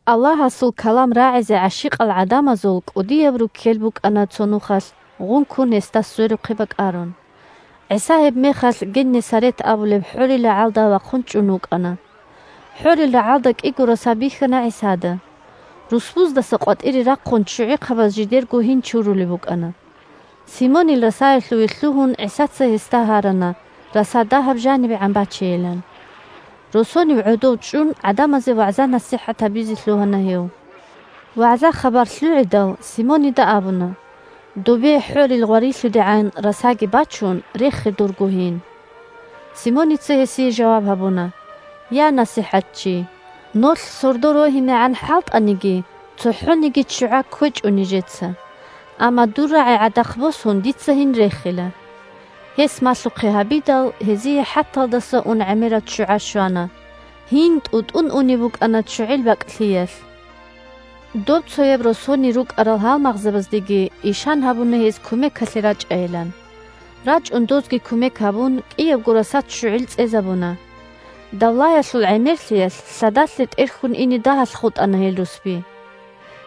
Аллагьасул калам рагӀизе гӀащикъал гӀадамазул кӀудияб руккел букӀана цо нухалъ гъункун гьесда сверухъе бакӀарун. ГӀиса гьебмехалъ Геннесарет абулеб хӀорил рагӀалда вахъун чӀун вукӀана. ХӀорил рагӀалда кӀиго раса бихьана ГӀисада. Русбуздаса къватӀире рахъун ччугӀихъабаз жидерго гьин чурулеб букӀана. Симонил расаялъуве лъугьун ГӀисаца гьесда гьарана раса дагьаб жанибегӀан бачейилан. Росонив гӀодов чӀун гӀадамазе вагӀза-насихӀат гьабизе лъугьана гьев. ВагӀза-хабар лъугӀидал, Симонида абуна: – Добе хӀорил гъварилъудегӀан расаги бачун, рехе дурго гьин. Симоница гьесие жаваб гьабуна: – Я, НасихӀатчи! Нолъ сордо рогьинегӀан хӀалтӀаниги, цохӀониги ччугӀа кквечӀо нижеца. Амма дур рагӀи гӀадахъ босун дица гьин рехила. Гьес малъухъе гьабидал, гьезие хӀаталдаса ун гӀемераб ччугӀа щвана. Гьин тӀутӀун унеб букӀана ччугӀил бакӀлъиялъ. Доб цояб росонир рукӀарал гьалмагъзабаздеги ишан гьабуна гьез кумекалъе рачӀайилан. РачӀун дозги кумек гьабун, кӀиябго раса ччугӀил цӀезабуна. Давлаялъул гӀемерлъиялъ лъадалъе тӀерхьун ине дагьалъ хутӀана гьел русби.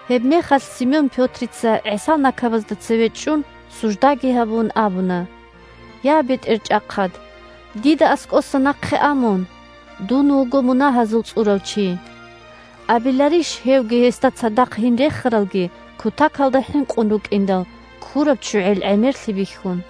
Гьебмехалъ Симон-Пётрица, ГӀисал накабазда цеве чӀун, суждаги гьабун, абуна: – Я, БетӀерчӀахъад! Дида аскӀоса нахъе а мун! Дун вуго мунагьазул цӀурав чи! Абиларищ, гьевги гьесда цадахъ гьин рехаралги кутакалда хӀинкъун рукӀиндал, ккураб ччугӀил гӀемерлъи бихьун.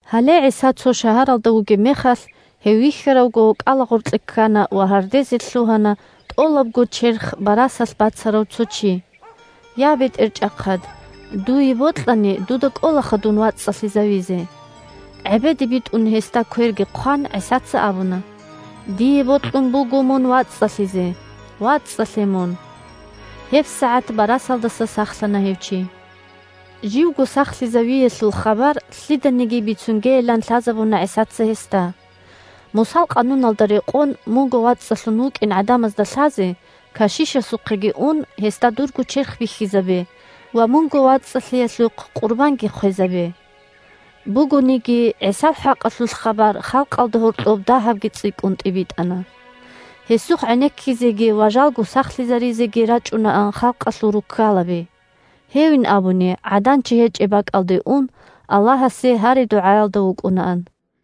Гьале ГӀиса цо шагьаралда вугеб мехалъ, гьев вихьаравго, кӀалагъоркье ккана ва гьардезе лъугьана тӀолабго черх барасалъ бацарав цо чи: – Я, БетӀерчӀахъад! Дуе бокьани, дуда кӀолаха дун вацӀцӀалъизавизе! ГӀебеде битӀун гьесда кверги хъван, ГӀисаца абуна: – Дие бокьун буго мун вацӀцӀалъизе. ВацӀцӀалъе мун! ГьебсагӀат барасалдаса сахлъана гьев чи. Живго сахлъизавиялъул хабар лъиданиги бицунгейилан лъазабуна ГӀисаца гьесда: – Мусал къануналда рекъон, мунго вацӀцӀалъун вукӀин гӀадамазда лъазе, кашишасухъеги ун, гьесда дурго черх бихьизабе ва мунго вацӀцӀалъиялъухъ къурбанги хъвезабе. Бугониги, ГӀисал хӀакъалъулъ хабар халкъалда гьоркьоб дагьабги цӀикӀкӀун тӀибитӀана. Гьесухъ гӀенеккизеги ва жалго сахлъизаризеги рачӀунаан халкъалъул руккалаби. Гьевин абуни, гӀадан-чи гьечӀеб бакӀалде ун, Аллагьасе гьари-дугӀаялда вукӀунаан.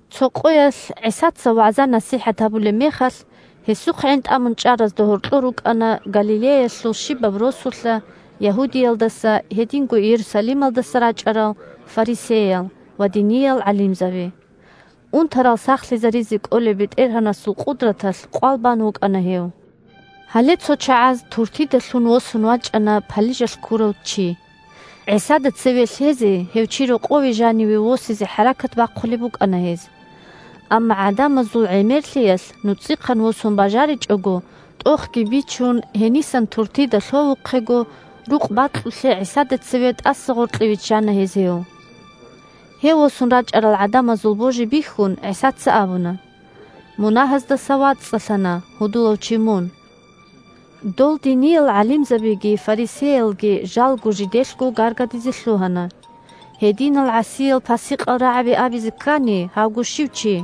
Цо къоялъ ГӀисаца вагӀза-насихӀат гьабулеб мехалъ, гьесухъ гӀинтӀамун чӀаразда гьоркьор рукӀана Галилеялъул щибаб росулъа, Ягьудиялдаса, гьединго Иерусалималдаса рачӀарал фарисеял ва диниял гӀалимзаби. Унтарал сахлъизаризе кӀолеб БетӀергьанасул къудраталъ къвал бан вукӀана гьев. Гьале цо чагӀаз туртида лъун восун вачӀана палижалъ ккурав чи. ГӀисада цеве лъезе гьев чи рокъове жаниве восизе хӀаракат бахъулеб букӀана гьез. Амма гӀадамазул гӀемерлъиялъ нуцӀихъан восун бажаричӀого, тӀохги бичун, гьенисан туртида лъовухъего рукъ бакьулъе ГӀисада цеве тӀаса гъоркье виччана гьез гьев. Гьев восун рачӀарал гӀадамазул божи бихьун, ГӀисаца абуна: – Мунагьаздаса вацӀцӀалъана, гьудулав чи, мун. Дол диниял гӀалимзабиги фарисеялги жалго жиделъго гаргадизе лъугьана: – Гьединал гӀасиял-пасикъал рагӀаби абизе ккани, гьавго щив чи!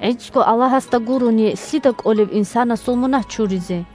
ГӀицӀго Аллагьасда гурони, лъида кӀолеб инсанасул мунагь чуризе?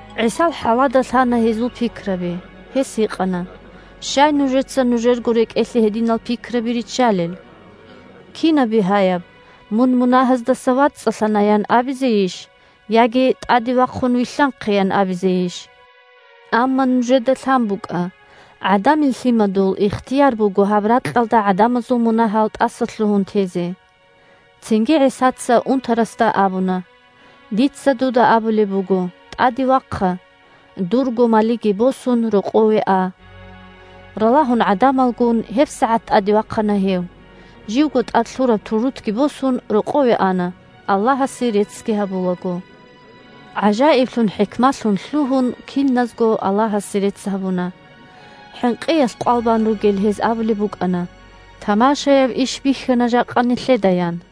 ГӀисал хӀалада лъана гьезул пикраби. Гьес гьикъана: – Щай нужеца нужерго рекӀелъе гьединал пикраби риччалел? Кинаб бигьаяб: «Мун мунагьаздаса вацӀцӀалъана», – ян абизейищ, яги: «ТӀаде вахъун, вилълъанхъе», – ян абизейищ? Амма нужеда лъан букӀа: ГӀадамил Лъимадул ихтияр буго гьаб ракьалда гӀадамазул мунагьал тӀасалъугьун тезе. Цинги ГӀисаца унтарасда абуна: – Дица дуда абулеб буго: тӀаде вахъа, дурго малиги босун, рокъове а. Ралагьун гӀадамалгун, гьебсагӀат тӀаде вахъана гьев, живго тӀад лъун вукӀараб турутги босун, рокъове ана, Аллагьасе реццги гьабулаго. ГӀажаиблъун-хӀикмалъун лъугьун, киназго Аллагьасе рецц гьабуна. ХӀинкъиялъ къвал бан ругел гьез абулеб букӀана: – Тамашаяб иш бихьана жакъа нилъеда! – ян.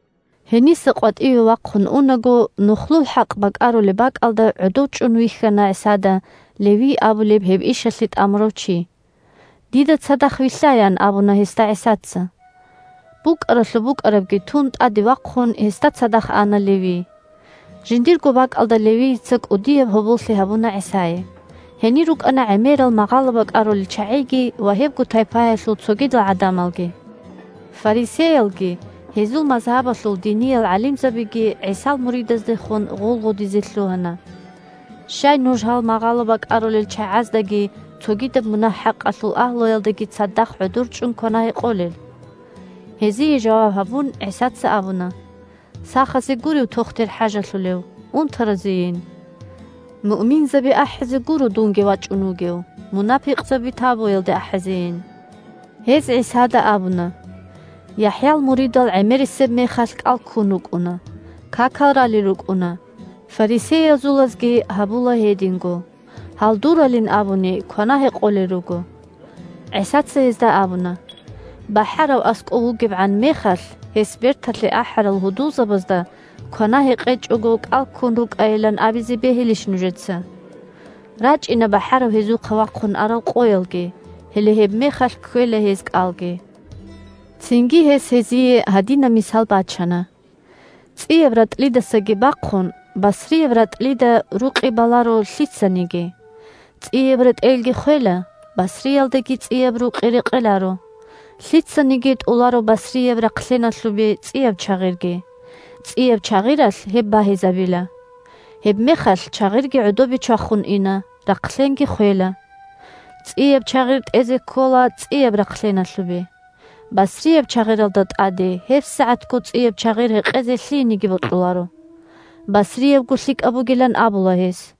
Гьениса къватӀиве вахъун унаго, нухлул хӀакъ бакӀарулеб бакӀалда гӀодов чӀун вихьана ГӀисада Левий абулев гьеб ишалъе тӀамурав чи. – Дида цадахъ вилълъа, – ян абуна гьесда ГӀисаца. БукӀаралъуб букӀарабги тун тӀаде вахъун, гьесда цадахъ ана Левий. Жиндирго бакӀалда Левийица кӀудияб гьоболлъи гьабуна ГӀисае. Гьенир рукӀана гӀемерал магъало бакӀарулел чагӀиги ва гьебго тайпаялъул цогидал гӀадамалги. Фарисеялги гьезул мазгьабалъул диниял гӀалимзабиги ГӀисал муридаздехун гъулгъудизе лъугьана: – Щай нуж гьал магъало бакӀарулел чагӀаздаги цогидаб мунагь-хӀакъалъул агьлуялдаги цадахъ гӀодор чӀун квана-гьекъолел? Гьезие жаваб гьабун ГӀисаца абуна: – Сахазе гурев тохтир хӀажалъулев, унтаразейин. Муъминзаби ахӀизе гуро дунги вачӀун вугев, мунапикъзаби тавбуялде ахӀизейин. Гьез ГӀисада абуна: – ЯхӀял муридал гӀемерисеб мехалъ кӀал ккун рукӀуна, какал ралел рукӀуна, фарисеязулазги гьабула гьединго. Гьал дуралин абуни квана-гьекъолел руго. ГӀисаца гьезда абуна: – БахӀарав аскӀов вугебгӀан мехалъ гьес берталъе ахӀарал гьудулзабазда квана-гьекъечӀого кӀал ккун рукӀайилан абизе бегьилищ нужеца? РачӀина бахӀарав гьезухъа вахъун арал къоялги, гьеле гьебмехалъ кквела гьез кӀалги. Цинги гьес гьезие гьадинаб мисал бачана: – ЦӀияб ратӀлидасаги бахъун басрияб ратӀлида рукъи баларо лъицаниги. ЦӀияб ретӀелги хвела, басриялдаги цӀияб рукъи рекъеларо. Лъицаниги тӀоларо басрияб рахълъеналъубе цӀияб чагъирги. ЦӀияб чагъиралъ гьеб багьизабила. Гьебмехалъ чагъирги гӀодобе чвахун ина, рахълъенги хвела. ЦӀияб чагъир тӀезе ккола цӀияб рахълъеналъубе. Басрияб чагъиралда тӀаде гьебсагӀатго цӀияб чагъир гьекъезе лъиениги бокьуларо. Басриябго лъикӀаб бугилан абула гьес.